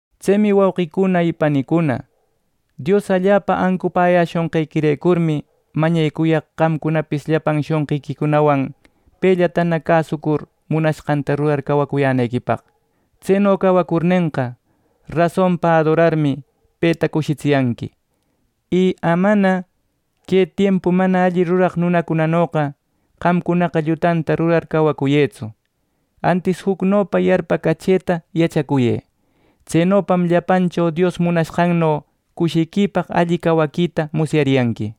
Tsemi wauqicuna panicuna, Dios allapa ancupäyäshonqequirecurmi mañecuyaq qamcunapis llapan shonqiquicunawan pellatana cäsucur, munashqanta rurar cawacuyänequipaq. Tseno cawacurnenqa, rasonpa adorarmi peta cushitsiyanqui. Y amana que tiempu mana alli ruraq nunacunanoqa qamcunaqa llutanta rurar cacuyëtsu; antis jucnopa yarpacachëta yachacuyë. Tsenopam llapancho Dios munashqanno cushiquipaq alli cawaquita musyariyanqui.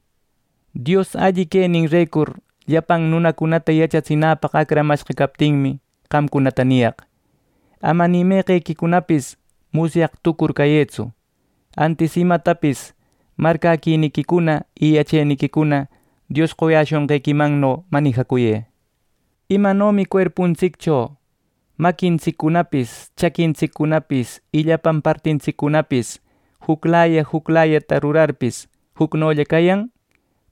Dios alli queninrecur llapan nunacunata yachatsinäpaq acramashqa captinmi qamcunata niyaq: Ama ni meqequicunapis musyaq tucur cayëtsu, antis imatapis marcäquiniquicuna y yacheniquicuna Dios qoyashunqequimanno manijacuyë. Imanomi cuerpuntsiccho maquintsiccunapis chaquintsiccunapis y llapan partintsiccunapis, juclaya juclayata rurarpis, jucnollam cayan;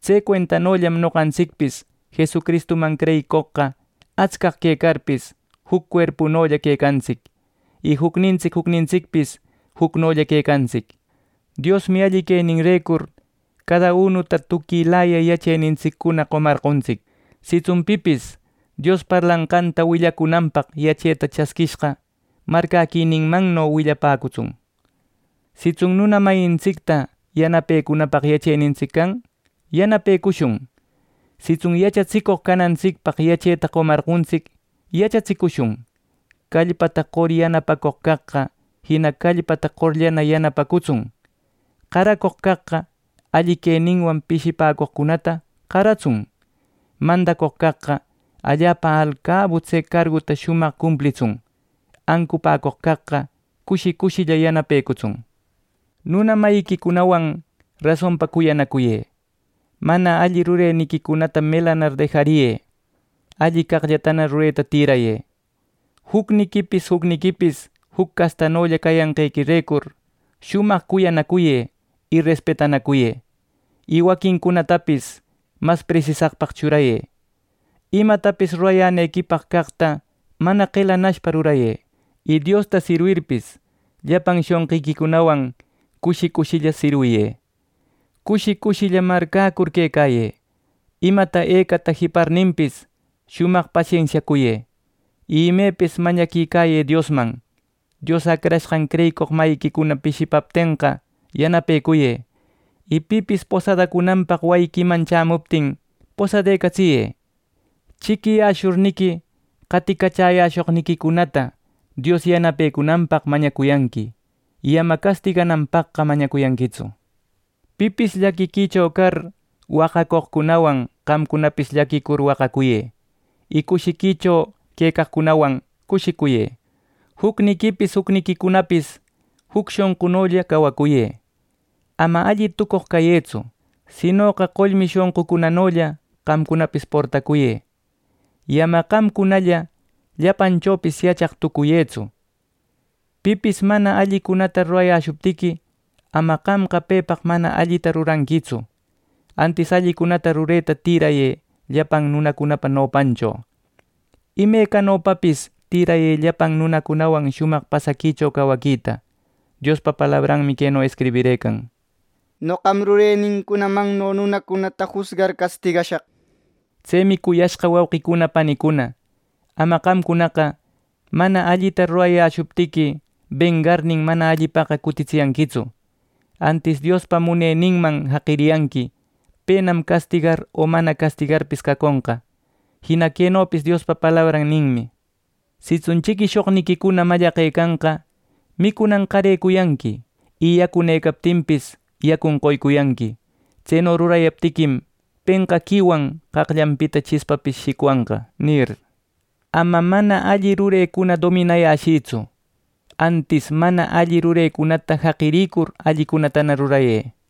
tse cuentallam noqantsicpis Jesucristuman creyicoqcunaqa atscaq quecarpis, juc cuerpunolla quecantsic, y jucnintsic jucnintsicpis jucnolla quecantsic. Diosmi alli queninrecur cada unuta tuquilaya yachenintsiccuna qomarqontsic. Sitsun pipis Dios parlanqanta willacunanpaq yacheta chasquishqa, marcäquininmanno willapäcutsun. Sitsun nuna mayintsicta yanapecunapaq yachenintsic can, yanapecushun. Sitsun yachatsicoq canantsicpaq yacheta qomarqontsic, yachatsicushun. Callpata qor yanapacoq caqqa, jina callpata qorllana yanapatsun. Qaracoq caqqa alli queninwan pishipäcoqcunata qaratsun. Mandacoq caqqa allapa alcabu tse carguta shumaq cumplitsun. Ancupäcoq caqqa cushi cushilla yanapecutsun. Nuna mayiquicunawan rasonpa cuyanacuyë. Mana alli rureniquicunata melanar dejariyë. Alli caqllatana rureta tïrayë. Jucniquipis jucniquipis juc castanolla cayanqequirecur, shumaq cuyanacuyë, y respetanacuyë, y waquincunatapis mas presisaqpaq churayë. Imatapis rurayänequipaq caqta mana qeläcushpa rurayë. Y Diosta sirwirpis, llapan shonqiquicunawan cushi cushilla sirwiyë. Cushi cushilla marcäcur quecayë. Imata ecata jiparninpis, shumaq pasensiacuyë. Y imepis mañaquicayë Diosman. Dios acrashqan creyicoq mayiquicuna pishipaptenqa yanapecuyë. Y pipis posadacunanpaq wayiquiman chämuptin posadecatsiyë. Chiquiyäshurniqui qaticachäyäshoqniquicunata Dios yanapecunanpaq mañacuyanqui y ama castigananpaqqa mañacuyanquitsu. Pipis llaquiquicho car waqacoqcunawan qamcunapis llaquicur waqacuyë y cushiquicho quecaqcunawan cushicuyë. Jucniquipis, jucniquicunapis juc shonqunolla cawacuyë. Ama alli tucoq cayëtsu, sinoqa qollmi shonqucunanolla qamcunapis portacuyë; y ama qamcunalla llapanchopis yachaq tucuyëtsu. Pipis mana allicunata rurayäshuptiqui, ama qamqa pepaq mana allitaqa ruranquitsu; antis allicunata rureta tirayë llapan nunacunapa nopancho. Imecanopapis tïrayë llapan nunacunawan shumaq pasaquicho cawaquita. Diospa palabranmi queno escribirëcan: “Noqam rurenincunamanno nunacunata jusgar castigashaq” nir. Tsemi cuyashqa wauqicuna panicuna, ama qamcunaqa mana allita rurayäshuptiqui, bengarnin mana allipaqa cutitsiyanquitsu. Antis Diospa muneninman jaqiriyanqui penam castigar o mana castigarpis caconqa. Jina quenopis Diospa palabran ninmi: “Sitsun chiquishoqniquicuna mallaqecanqa micunan qarecuyanqui, y yacunëcaptinpis yacun qoycuyanqui. Tseno rurayaptiquim penqaquiwan qaqllanpita chispapis shicwanqa” nir. Ama mana alli rurecuna dominayäshïtsu; antis mana alli rurecunata jaqirïcur allicunatana rurayë.